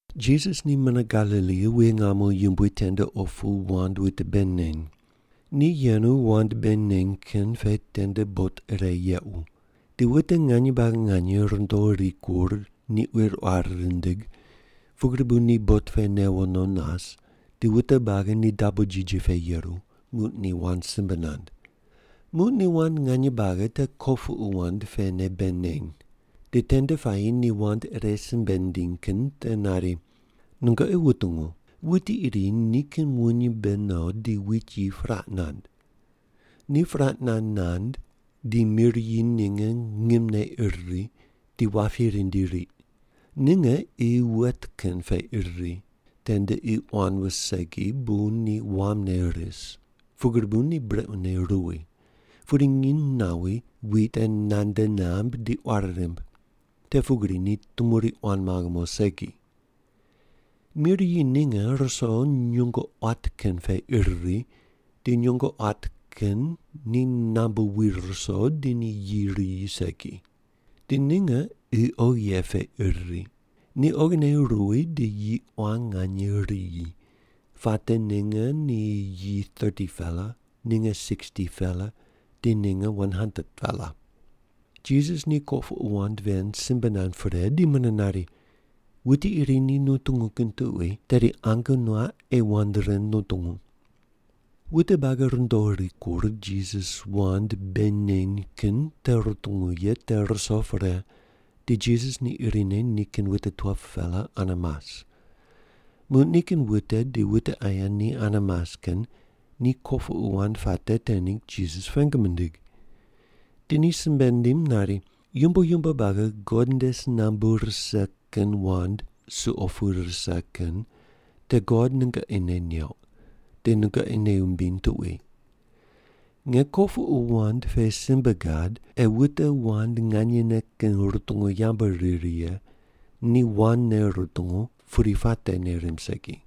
Jisas ni mune Galili wuye ngamo yumbui tende opu wand wute bei neny. Ni yenu wand bei neny kin pe tende bot ire yequ. Di wute nganye buagi nganye rundo rikur ni quir quar rindig, pugri bu ni bot pe newo no nas, di wute buagi ni dabo jiji pe yeru, muq ni wand simbe nand. Muq ni wand nganye buagi te kopuqu wand pene bei neny. Di tende puayi ni wand ire simbe nindiny kin te nari, “Nungoqi wutungu! Wuti iri nikin wuny mbe no di wit yi puraq nand. Ni puraq nand nand di mir yi ninge ngimne ir ri, di wapi rindi riq. Ninge qi wet kin pe ir ri. Tende qi quan wus segi bu ni wamne ris, pugri bu ni brequne ruwi, pudi nginy nawi, wit te nande namb di quari rimb. Te pugri ni tumuri quan maghe mo segi. Mir yi ninge ruso nyungo quat kin pe ir ri di nyungo quat kin ni nambu wi ruso di ni yi riyi segi. Di ninge qi oghi ye pe ir ri. Ni oghine ruwi di yi quan nganye riyi, puate ninge ni yi 30-pela, ninge 60-pela di ninge 100-pela.” Jisas ni kopuqu wand ven simbe nand pre di mune nari, “Wuti iri ni nutungu kin tuqui tedi ange nuaq ei wand ren nutungu.” Wute buagi rundo rikur Jisas wand bei neny kin te rutungu ye te ruso pre, di Jisas ni irine nikin wute 12-pela ane mas. Muq nikin wute di wute aye ni ane mas kin ni kopuqu wand puate te ningg Jisas pengu mindig. Di ni simbe nindim nari, “Yumbo yumbo buagi God nde si nambu rise kin wand suqo pu rise kin te God nungoqi nei neuq di nungoqi nei wumbiny tuqui. Nge kopuqu wand pe simbe gad ei wute wand nganyene kin rutungu yambu riri ye ni wandne rutungu pudi puate nei rimb segi.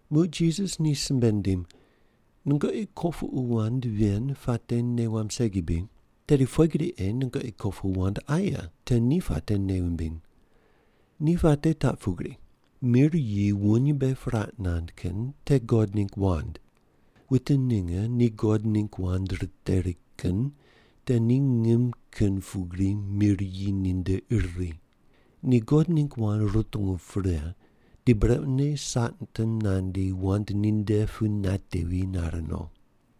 Muq Jisas ni simbe nindim, “Nungoqi kopuqu wand ven puate nei wamb segi bri? Tedi pughe gri ei nungoqi kopuqu wand aye te ni puate nei wumbiny? Ni puate taq pugri. Mir yi wuny mbe puraq nand kin te God ningg wand. Wute ninge ni God ningg wand riteri kin te ni ngim kin pugri mir yi ninde ir ri. Ni God ningg wand rutungu pre, di brequne Satan nandi wand ninde pu natevi nare no.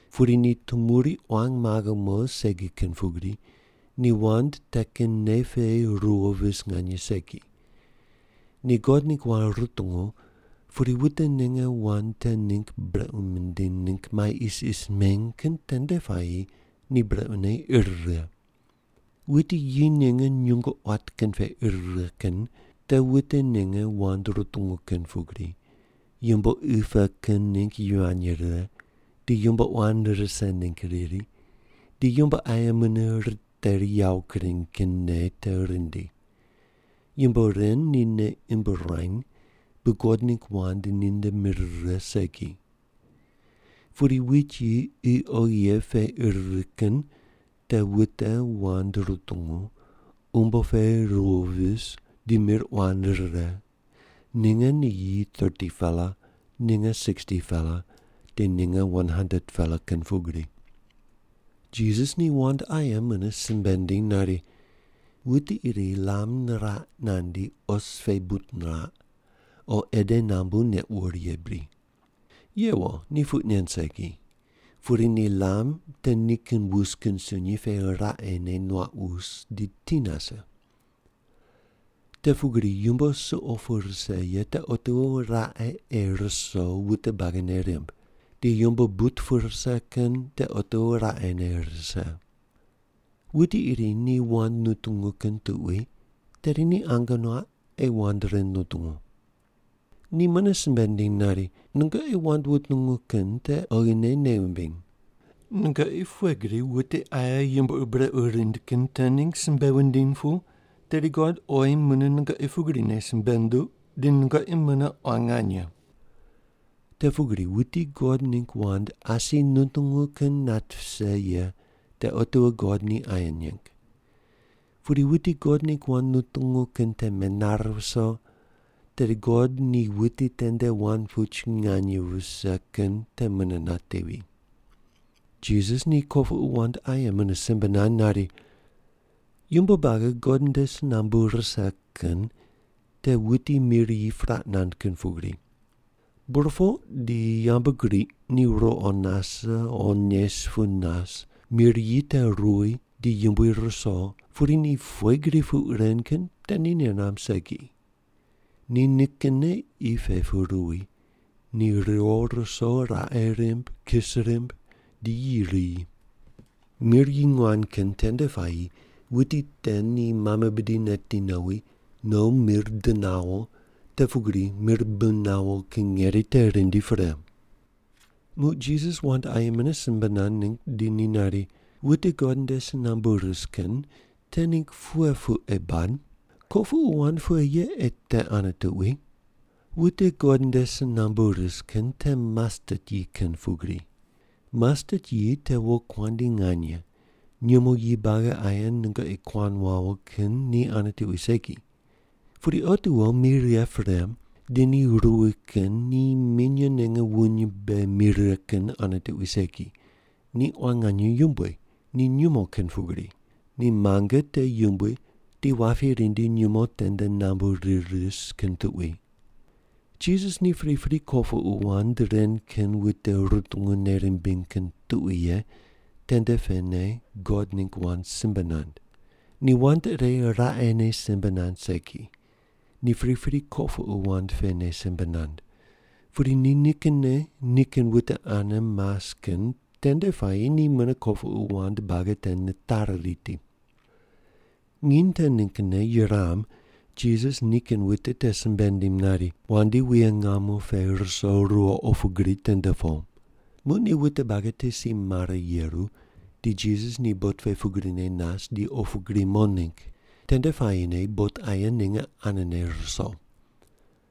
Pudi ni tumuri quan maghe mo segi kin pugri, ni wand te kin nei pe ruwo vis nganye segi. Ni God ningg wand rutungu, pudi wute ninge wand te ningg brequ mindiny ningg mai isis meny kin tende puayi ni brequne ir righe. Wit yi ninge nyungo quat kin pe ir righe kin te wute ninge wand rutungu kin pugri, yumbo qi pe kin ningg yivany rirany, di yumbo quan rise ningg riri, di yumbo aye mune riteri yawo kureny kin nei te rindi. Yumbo ren ni nei imb ruany bu God ningg wand ni nde mir rire segi. Pudi wit yi qi oghi ye pe ir ri kin te wute wand rutungu, umbo pe ruwo vis di mir quan rire, ninge ni yi 30-pela, ninge 60-pela, di ninge 100-pela kin pugri.” Jisas ni wand aye mune simbe nindim nari, “Wuti iri lam niraq nandi os pe but niraq o ede nambu neq wur ye bri? Yewo, ni puq nen segi, pudi ni lam te nikin wus kin sunyi pe raqene nuaq wus di ti nase. Te pugri yumbo suqo pu rise ye te otiwo raqe ei ruso wute buagi nei rimb, di yumbo but pu rise kin te otiwo raqene ei rise. Wuti iri ni wand nutungu kin tuqui tedi ni ange nuaq ei wand ren nutungu.” Ni mune simbe nindim nari, “Nungoqi wand wutungu kin te oghine nei wumbiny. Nungoqi pughe gri wute aye yumbo ur brequ rind kin te ningg simbe wundiny pu, tedi God oyi mune nungoqi pugrine simbe nunduq, di nungoqi mune quan nganye. Te pugri wuti God ningg wand asi nutungu kin nat vise ye te otiwo God ni aye neng, pudi wuti God ningg wand nutungu kin te menare viso, tedi God ni wuti tende wand puch nganye vise kin te mune natevi.” Jisas ni kopuqu wand aye mune simbe nand nari, “Yumbo buagi God nde si nambu rise kin te wuti mir yi puraq nand kin pugri. Burpoq di yambgriq ni ruqo nase o nes pu nas, mir yi te ruwi di yumbui ruso pudi ni pughe gri puq ren kin te ni nei namb segi. Ni nikinne qi pe pu ruwi, ni riwo ruso raqe rimb, kis rimb di yi riyi. Mir yi nguan kin tende puayi wuti te ni mame bidi neti nowi, no mir di nawo, te pugri mir bi nawo kin ngeri te rindi pre.” Muq Jisas wand aye mune simbe nand ningg di ni nari, “Wute God nde si nambu ris kin te ningg pughe puq ei bad? Kopuqu wand pughe ye ei te ane tuqui? Wute God nde si nambu ris kin te mastet yi kin pugri. Mastet yi te wokuandi nganye nyumo yi buagi aye nungoqi kuan wawo kin ni ane tuqui segi. Pudi otiwo mi righe pre, di ni ruwi kin ni minye ninge wuny mbe mi righe kin ane tuqui segi, ni quan nganye yumbui, ni nyumo kin pugri. Ni muange te yumbui di wapi rindi nyumo tende nambu rir ris kin tuqui.” Jisas ni pripri kopuqu wand ren kin wute rutungu nei rimbiny kin tuqui ye tende pene God ningg wand simbe nand. Ni wand ire raqene simbe nand segi, ni pripri kopuqu wand pene simbe nand. Pudi ni nikinne nikin wute ane mas kin tende puayi ni mune kopuqu wand buagi te nitari riti. Nginy te ninggne yuram Jisas ni nikin wute te simbe nindim nari, “Wandi wuye ngamo pe ruso ruwo opu gri tende po.” Muq ni wute buagi te si mare yeru, di Jisas ni bot pe pugrine nas di opu gri mo ningg. Tende puayine bot aye ninge anene ruso.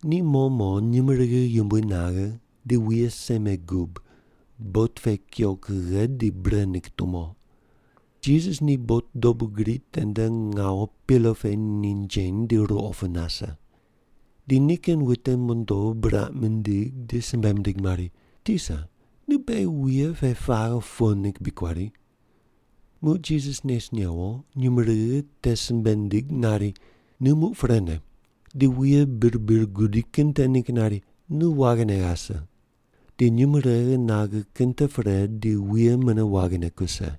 Ni mo mo nyumurighi yumbui naghe di wuye seme gub bot pe kuyo kughe di bre ningg tumo. Jisas ni bot dobu gri tende ngawu pilo pe ninjeny di ruqo pu nase. Di nikin wute mondo buraq mindig di simbe mindig mari, “Tisa, nu beghi wuye pe paghe po ningg bri kuari?” Muq Jisas nes newo nyumurighi te simbe nindig nari, “Nu muq prene!” Di wuye bir bir gudi kin te ningg nari, “Nu waghine ghase!” Di nyumurighi naghe kin te pre di wuye mune waghine kuse.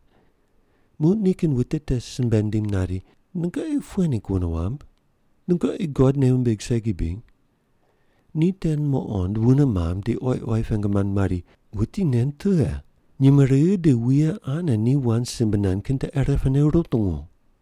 Muq nikin wute te simbe nindim nari, “Nungoqi pughe ningg wune wamb? Nungoqi God nei wumbig segi bri?” Ni te muqond wune mamb di oyi oyi pengu mand mari, “Wuti nen tughe? Nyumurighi di wuye ane ni wand simbe nand kin te irepene rutungu!”